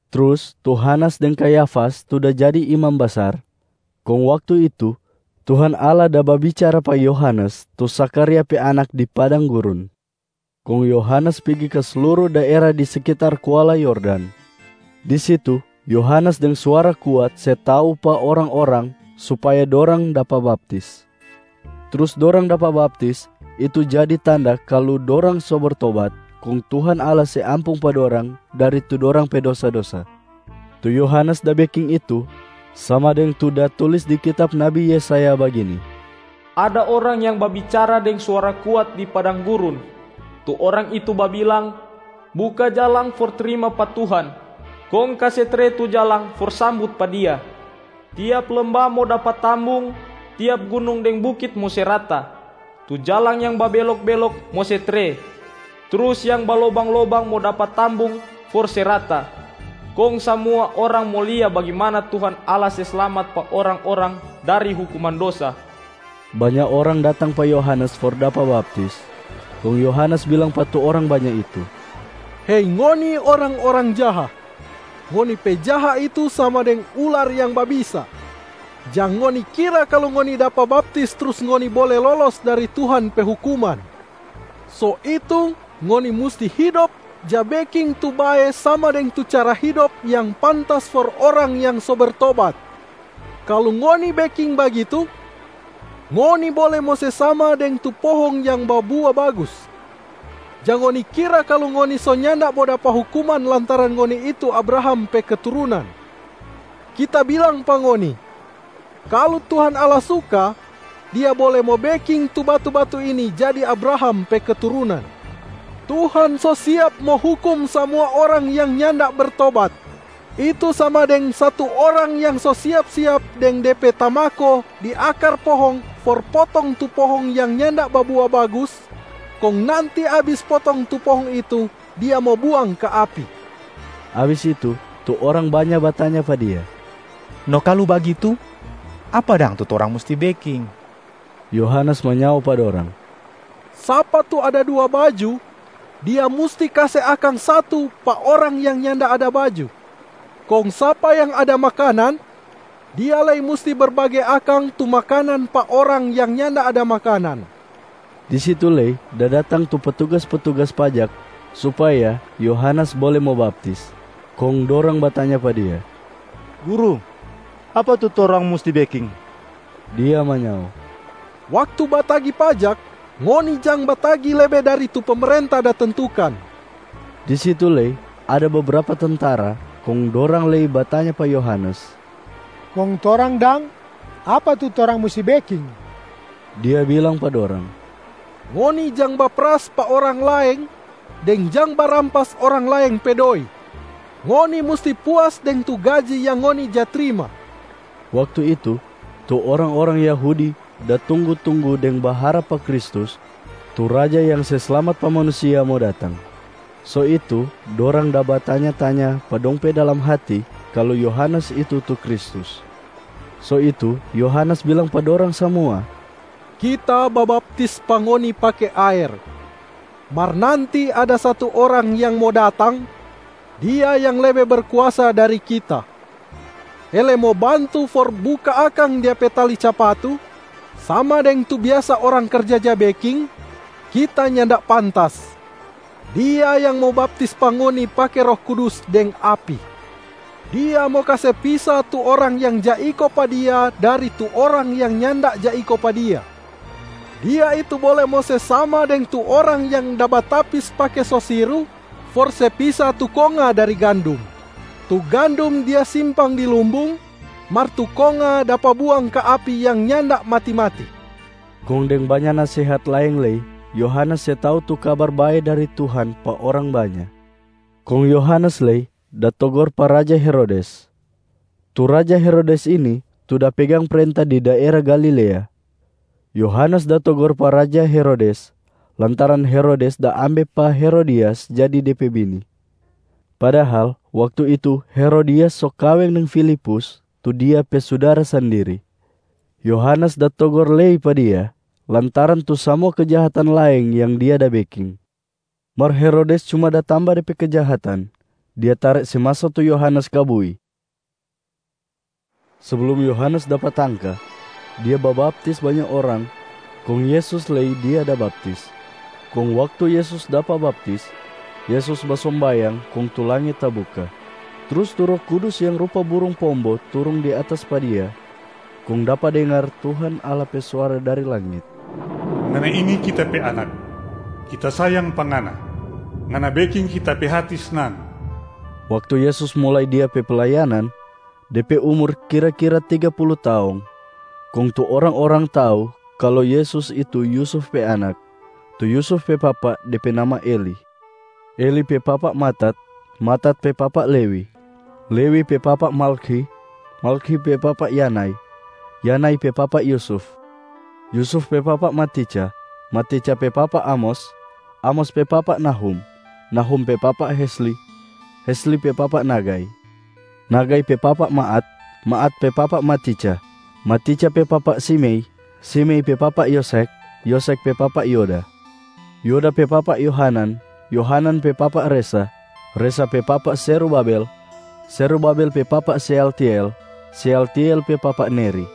Trus tu Hanas deng Kayafas tu da jadi imam basar. Kong waktu itu, Tuhan Allah da babicara pa Yohanes tu Zakharia pe anak di padang gurun. Kong Yohanes pigi ka sluru daera di sekitar kuala Yordan. Di situ Yohanes deng suara kuat se tau pa orang-orang supaya dorang dapa baptis. Trus dorang dapa baptis, itu jadi tanda kalu dorang so bertobat kong Tuhan Allah se ampung pa dorang dari tu dorang pe dosa-dosa. Tu Yohanes da beking itu sama deng tu da tulis di kitab nabi Yesaya bagini, “Ada orang yang babicara deng suara kuat di padang gurun. Tu orang itu babilang, ‘Buka jalang for trima pa Tuhan, kong kase tre tu jalang for sambut pa Dia.’ Tiap lembah mo dapa tambung. Tiap gunung deng bukit mo se rata. Tu jalang yang babelok-belok mo se tre, trus yang balobang-lobang mo dapa tambung for se rata. Kong samua orang mo lia bagimana Tuhan Allah se slamat pa orang-orang dari hukuman dosa.” Banya orang datang pa Yohanes for dapa baptis. Kong Yohanes bilang pa tu orang banya itu, “Hei ngoni orang-orang jaha, ngoni pe jaha itu sama deng ular yang babisa! Jang ngoni kira kalu ngoni dapa baptis trus ngoni bole lolos dari Tuhan pe hukuman. So itu ngoni musti hidop ja beking tu bae sama deng tu cara hidop yang pantas for orang yang so bertobat. Kalu ngoni beking bagitu, ngoni bole mo se sama deng tu pohong yang babua bagus. Jang ngoni kira kalu ngoni so nyanda mo dapa hukuman lantaran ngoni itu Abraham pe keturunan. Kita bilang pa ngoni, kalu Tuhan Allah suka, Dia bole mo beking tu batu-batu ini jadi Abraham pe keturunan. Tuhan so siap mo hukum samua orang yang nyanda bertobat, itu sama deng satu orang yang so siap-siap deng de pe tamako di akar pohong for potong tu pohong yang nyanda babua bagus, kong nanti abis potong tu pohong itu, dia mo buang ka api.” Abis itu, tu orang banya batanya pa dia, “No kalu bagitu, apa dang tu torang musti beking?” Yohanes manyao pa dorang, “Sapa tu ada dua baju, dia musti kase akang satu pa orang yang nyanda ada baju. Kong sapa yang ada makanan, dia lei musti berbage akang tu makanan pa orang yang nyanda ada makanan.” Di situ lei da datang tu petugas-petugas pajak supaya Yohanes bole mo baptis. Kong dorang batanya pa dia, “Guru, apa tu torang musti beking?” Dia manyao, “Waktu batagi pajak, ngoni jang batagi lebe dari tu pemerenta da tentukan.” Di situ lei ada bebrapa tentara kong dorang lei batanya pa Yohanes, “Kong torang dang, apa tu torang musti beking?” Dia bilang pa dorang, “Ngoni jang baperas pa orang laeng, deng jang barampas orang laeng pe doi. Ngoni musti puas deng tu gaji yang ngoni ja trima.” Waktu itu, tu orang-orang Yahudi da tunggu-tunggu deng baharap pa Kristus tu Raja yang se slamat pa manusia mo datang. So itu dorang da batanya-tanya pa dong pe dalam hati kalu Yohanes itu tu Kristus. So itu Yohanes bilang pa dorang samua, “Kita babaptis pa ngoni pake aer, mar nanti ada satu Orang yang mo datang, Dia yang lebe berkuasa dari kita. Hele mo bantu for buka akang Dia pe tali capatu sama deng tu biasa orang karja ja beking, kita nyanda pantas. Dia yang mo baptis pa ngoni pake Roh Kudus deng api.a Dia mo kase pisa tu orang yang ja iko pa Dia dari tu orang yang nyanda ja iko pa Dia. Dia itu bole mo se sama deng tu orang yang da batapis pake sosiru for se pisa tu konga dari gandum. Tu gandum dia simpang di lumbung, mar tu konga dapa buang ka api yang nyanda mati-mati.” Kong deng banya nasehat laeng lei Yohanes se tau tu Kabar Bae dari Tuhan pa orang banya. Kong Yohanes lei da togor pa raja Herodes. Tu raja Herodes ini tu da pegang prenta di daera Galilea. Yohanes da togor pa raja Herodes lantaran Herodes da ambe pa Herodias jadi de pe bini, padahal waktu itu Herodias so kaweng deng Filipus tu dia pe sudara sandiri. Yohanes da togor lei pa dia lantaran tu samua kejahatan laeng yang dia da beking. Mar Herodes cuma da tamba de pe kejahatan, dia tare se maso tu Yohanes ka bui. Seblum Yohanes dapa tangka, dia babaptis banya orang kong Yesus lei dia da baptis. Kong waktu Yesus dapa baptis, Yesus basombayang kong tu langit tabuka, trus tu Roh Kudus yang rupa burung pombo turung di atas pa Dia. Kong dapa dengar Tuhan Allah pe suara dari langit, “Ngana ini Kita pe Anak, Kita sayang pa Ngana. Ngana beking Kita pe hati snang.” Waktu Yesus mulai Dia pe playanan, De pe umur kira-kira tiga pulu taong. Kong tu orang-orang tau kalu Yesus itu Yusuf pe anak. Tu Yusuf pe papa, de pe nama Eli. Eli pe papa Matat, Matat pe papa Lewi, Lewi pe papa Malkhi, Malkhi pe papa Yanai, Yanai pe papa Yusuf, Yusuf pe papa Matica, Matica pe papa Amos, Amos pe papa Nahum, Nahum pe papa Hesli, Hesli pe papa Nagai, Nagai pe papa Maat, Maat pe papa Matica, Matica pe papa Simei, Simei pe papa Yosekh, Yosekh pe papa Yoda, Yoda pe papa Yohanan, Yohanan pe papa Resa, Resa pe papa Zerubabel, Zerubabel pe papa Sealtiel, Sealtiel pe papa Neri,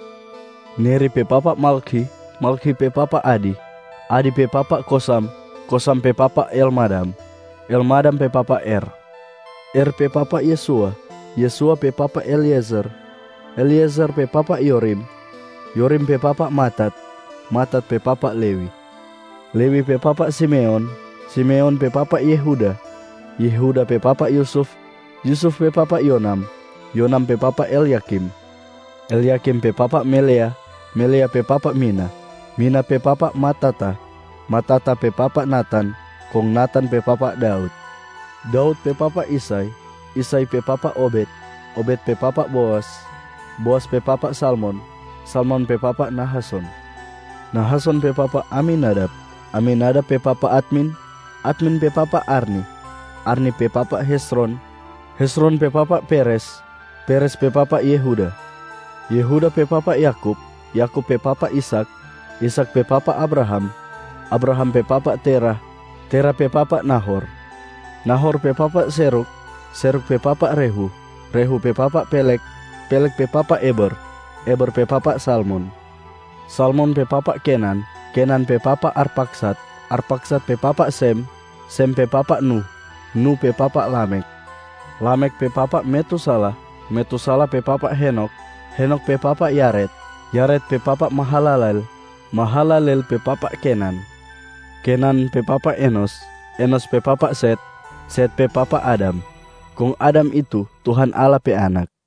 Neri pe papa Malkhi, Malkhi pe papa Adi, Adi pe papa Kosam, Kosam pe papa Elmadam, Elmadam pe papa Er, Er pe papa Yesua, Yesua pe papa Eliezer, Eliezer pe papa Yorim, Yorim pe papa Matat, Matat pe papa Lewi, Lewi pe papa Simeon, Simeon pe papa Yehuda, Yehuda pe papa Yusuf, Yusuf pe papa Yonam, Yonam pe papa Elyakim, Elyakim pe papa Melea, Melea pe papa Mina, Mina pe papa Matata, Matata pe papa Natan, kong Natan pe papa Daud, Daud pe papa Isai, Isai pe papa Obed, Obed pe papa Boas, Boas pe papa Salmon, Salmon pe papa Nahason, Nahason pe papa Aminadab, Aminadab pe papa Admin, Admin pe papa Arni, Arni pe papa Hezron, Hezron pe papa Peres, Peres pe papa Yehuda, Yehuda pe papa Yakub, Yakub pe papa Ishak, Ishak pe papa Abraham, Abraham pe papa Terah, Terah pe papa Nahor, Nahor pe papa Serug, Serug pe papa Rehu, Rehu pe papa Peleg, Peleg pe papa Eber, Eber pe papa Salmon, Salmon pe papa Kenan, Kenan pe papa Arpakhsad, Arpakhsad pe papa Sem, Sem pe papa Nuh, Nuh pe papa Lamekh, Lamekh pe papa Metusalah, Metusalah pe papa Henokh, Henokh pe papa Yared, Yared pe papa Mahalaleel, Mahalaleel pe papa Kenan, Kenan pe papa Enos, Enos pe papa Set, Set pe papa Adam. Kong Adam itu, Tuhan Allah pe anak.